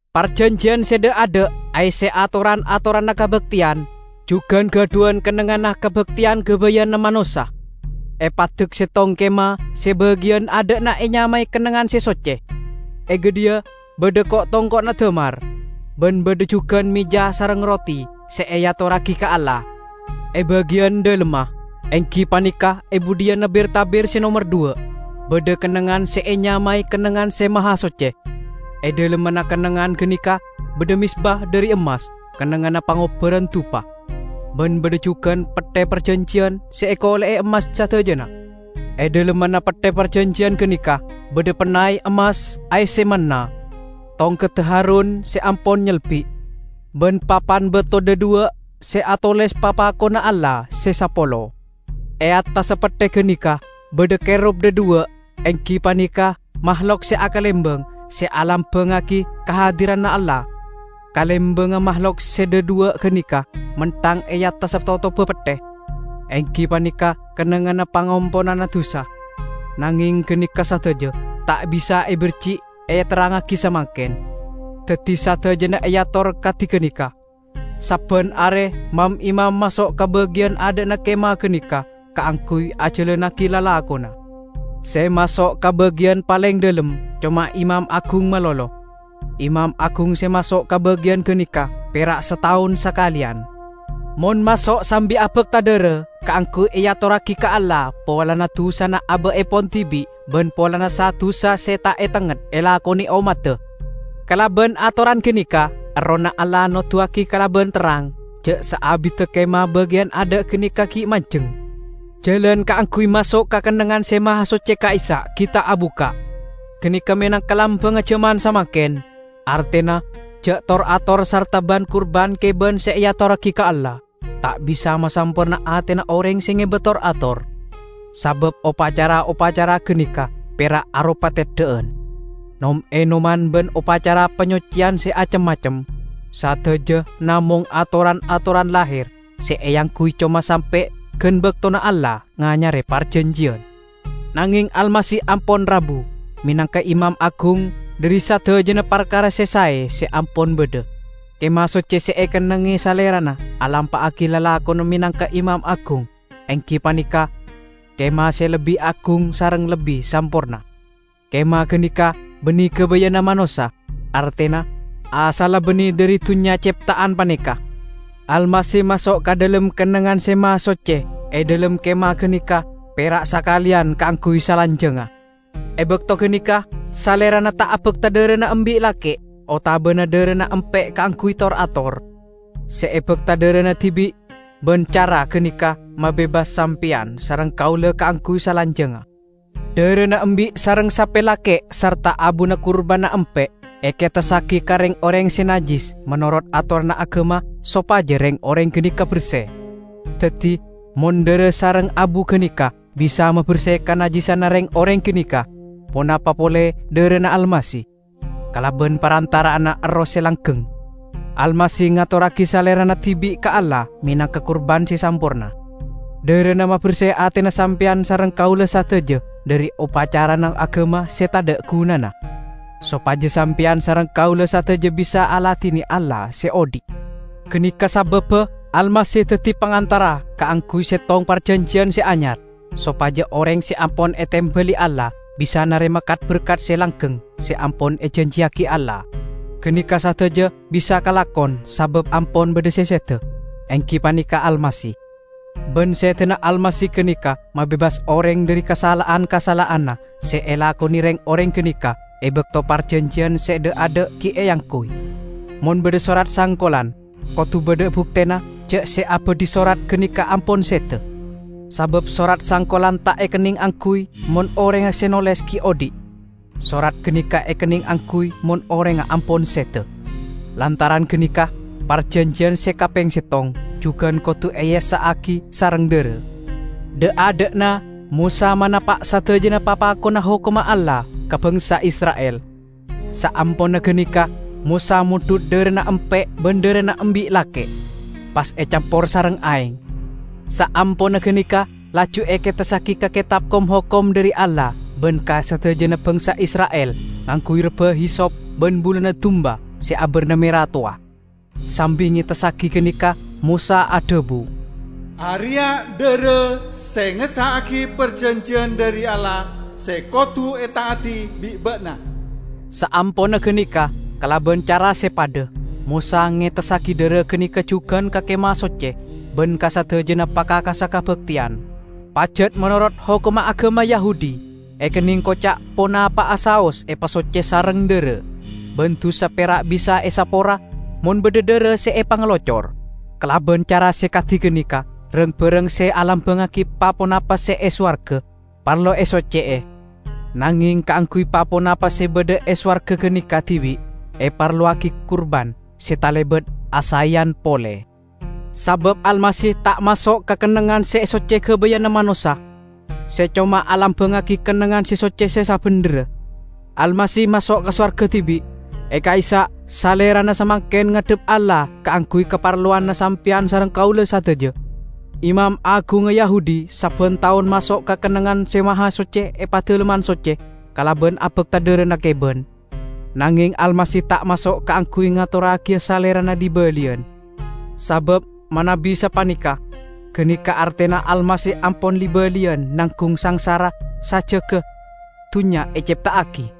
Parjanjiyan se dha'-adha' aesse atoran-atoranna kabakteyan, jugan gadhuwan kennengnganna kabakteyan gabayanna manossa. Epaddek settong kemah se bagiyan adha'na enyamae Kennengngan Se Socce. E gadhiya badha ko'-tongko'na damar, ban badha jugan meja sareng roti se eatorragi ka Allah. E bagiyan dhalemma, enggi paneka e budhiyanna bir-tabir se nomer dhuwa', badha kennengngan se enyamae Kennengngan Se Mahasocce. E dhalemmanna kennengngan ganeka badha mezba dhari emmas kennengnganna pangobbaranna dupa, ban badha jugan Petthe Parjanjiyan se ekole'e emmas sadajana. E dhalemmanna Petthe Parjanjiyan ganeka badha pennay emmas aesse manna, tongkedda Harun se ampon nyelbi', ban papan bato dhadhuwa' se atoles papakonna Allah se sapolo. E attassa Petthe ganeka badha Kerub dhadhuwa', enggi paneka mahlok se akalembang se alambangngagi kahadiranna Allah. Kalembangnga mahlok se dhadhuwa' ganeka menthang e attassa totobba Petthe, enggi paneka kennengnganna pangamponanna dusa. Nangeng ganeka sadaja ta' bisa ebirji' eterrangngagi samangken. Daddi sadajana eator kadi ganeka. Sabban are mam-imam maso' ka bagiyan adha'na kemah ganeka kaangguy ajalannagi lalakonna. Se maso' ka bagiyan paleng dhalem coma imam agung malolo. Imam agung se maso' ka bagiyan ganeka pera' sataon sakaleyan. Mon maso' sambi abakta dhara kaangguy eatorragi ka Allah polana dusana aba'epon dibi' ban polana sa-dusa se ta' etengnget elakone ommadda. Kalaban atoran ganeka, Errohna Allah noduwagi kalaban terrang, ja' saabidda kemah bagiyan adha' ganeka gi' manjeng, jalan kaangguy maso' ka Kennengngan Se Mahasocce ka'issa' gi' ta' abukka'. Ganeka menangka lambangnga jaman samangken; artena ja' tor-ator sarta ban-kurban keban se eatorragi ka Allah, ta' bisa masamporna atena oreng se ngeba tor-ator. Sabab opacara-opacara ganeka pera' aropa teddha'an, nom-enoman ban opacara panyocceyan se acem-macem. Sadaja namong atoran-atoran laher se eangguy coma sampe' gan baktona Allah nganyare parjanjiyan. Nangeng Almasih ampon rabu menangka Imam Agung dhari sadajana parkara se sae se ampon badha. Kemah Socce se ekennengnge Salerana alampa'agi lalakonna menangka Imam Agung enggi paneka kemah se lebbi agung sareng lebbi samporna. Kemah ganeka banne gabayanna manossa; artena, asalla banne dhari dunnya cepta'an paneka. Almasih maso' ka dhalem Kennengngan Se Mahasocce e dhalem kemah ganeka pera' sakaleyan kaangguy salanjangnga. E bakto ganeka Salerana ta' abakta dharana embi' lake' otabana dharana empe' kaangguy tor-ator; se ebakta dharana dibi', ban cara ganeka mabebas sampeyan sareng kaula kaangguy salanjangnga. Dharana embi' sareng sape lake' sarta abuna kurbanna empe', eketessagi ka reng-oreng se najjis menorot atoranna agama sopaja reng-oreng ganeka berse. Daddi, mon dhara sareng abu ganeka bisa maberse kanajjisanna reng-oreng ganeka, ponapa pole dharana Almasih! Kalaban parantara'anna Erroh se langgeng, Almasih ngatorragi Salerana dibi' ka Allah menangka kurban se samporna. Dharana maberse atena sampeyan sareng kaula sadaja dhari opacarana agama se tadha' gunana, sopaja sampeyan sareng kaula sadaja bisa aladine Allah se odhi'. Ganeka sababba Almasih daddi Pangantara kaangguy settong parjanjiyan se anyar, sopaja oreng se ampon etembali Allah bisa narema kat-berkat se langgeng se ampon ejanjiyagi Allah. Ganeka sadaja bisa kalakon sabab ampon badha se seda, enggi paneka Almasih; ban sedana Almasih ganeka mabebas oreng dhari kasala'an-kasala'anna se elakone reng-oreng ganeka e bakto parjanjiyan se dha'-adha' gi' eangguy. Mon badha sorat sangkolan, kodu badha buktena ja' se abadhi sorat ganeka ampon seda. Sabab sorat sangkolan ta' ekenneng angguy mon orengnga se noles gi' odhi'. Sorat ganeka ekenneng angguy mon orengnga ampon seda. Lantaran ganeka parjanjiyan se kapeng settong jugan kodu eessa'agi sareng dhara. Dha'-adha'na Mosa manapa' sadajana papakonna hokomma Allah ka bangsa Isra'il. Saamponna ganeka Mosa mondhut dharana empe' ban dharana embi' lake', pas ecampor sareng aeng, saamponna ganeka laju eketessagi ka Ketab Kom-hokom dhari Allah ban ka sadajana bangsa Isra'il ngangguy rebba hisop ban buluna dumba se abarna mera towa. Sambi ngetessagi ganeka Mosa adhabu, "Areya' dhara se ngessa'agi parjanjiyan dhari Allah se kodu eta'adi bi' ba'na." Saamponna ganeka, kalaban cara se padha, Mosa ngetessagi dhara ganeka jugan ka Kemah Socce ban ka sadajana pakakassa kabakteyan. Pajat menorot hokomma agama Yahudi, ekenneng koca' ponapa'a saos epasocce sareng dhara, ban dusa pera' bisa esapora mon badha dhara se epangalocor. Kalaban cara se kadi ganeka rang-barang se alambangngagi pa-ponapa se e sowarga, parlo esocce'e. Nangeng kaangguy pa-ponapa se badha e sowarga ganeka dibi' eparlowagi kurban se talebat asaeyan pole. Sabab Almasih ta' maso' ka Kennengngan Se Socce gabayanna manossa, se coma alambangngagi Kennengngan Se Socce se sabendherra. Almasih maso' ka sowarga dibi'; e ka'issa' Salerana samangken ngadhep Allah kaangguy kaparlowanna sampeyan sareng kaula sadaja. Imam agungnga Yahudi sabban taon maso' ka Kennengngan Se Mahasocce e Padalemman Socce kalaban abakta dharana keban. Nangeng Almasih ta' maso' kaangguy ngatorragiya Salerana li-baliyan. Sabab manabi sapaneka, ganeka artena Almasih ampon li-baliyan nanggung sangsara sajjegga dunnya ecepta'agi.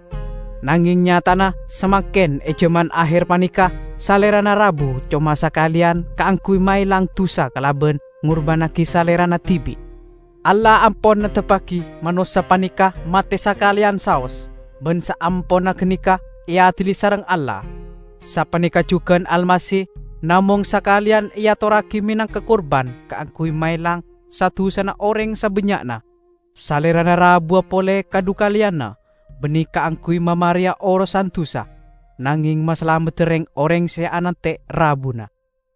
Nangeng nyatana, samangken e jaman aher paneka, Salerana rabu coma sakaleyan kaangguy maelang dusa kalaban ngurbannagi Salerana dibi'. Allah ampon neptebbagi manossa paneka mate sakaleyan saos ban saamponna ganeka eadili sareng Allah. Sapaneka jugan Almasih namong sakaleyan eatorragi menangka kurban kaangguy maelang sa-dusana oreng sabannya'na. Salerana rabuwa pole kadhukaleyanna, banne kaangguy mamareya orosan dusa, nangeng masalamedda reng-oreng se anante' rabuna.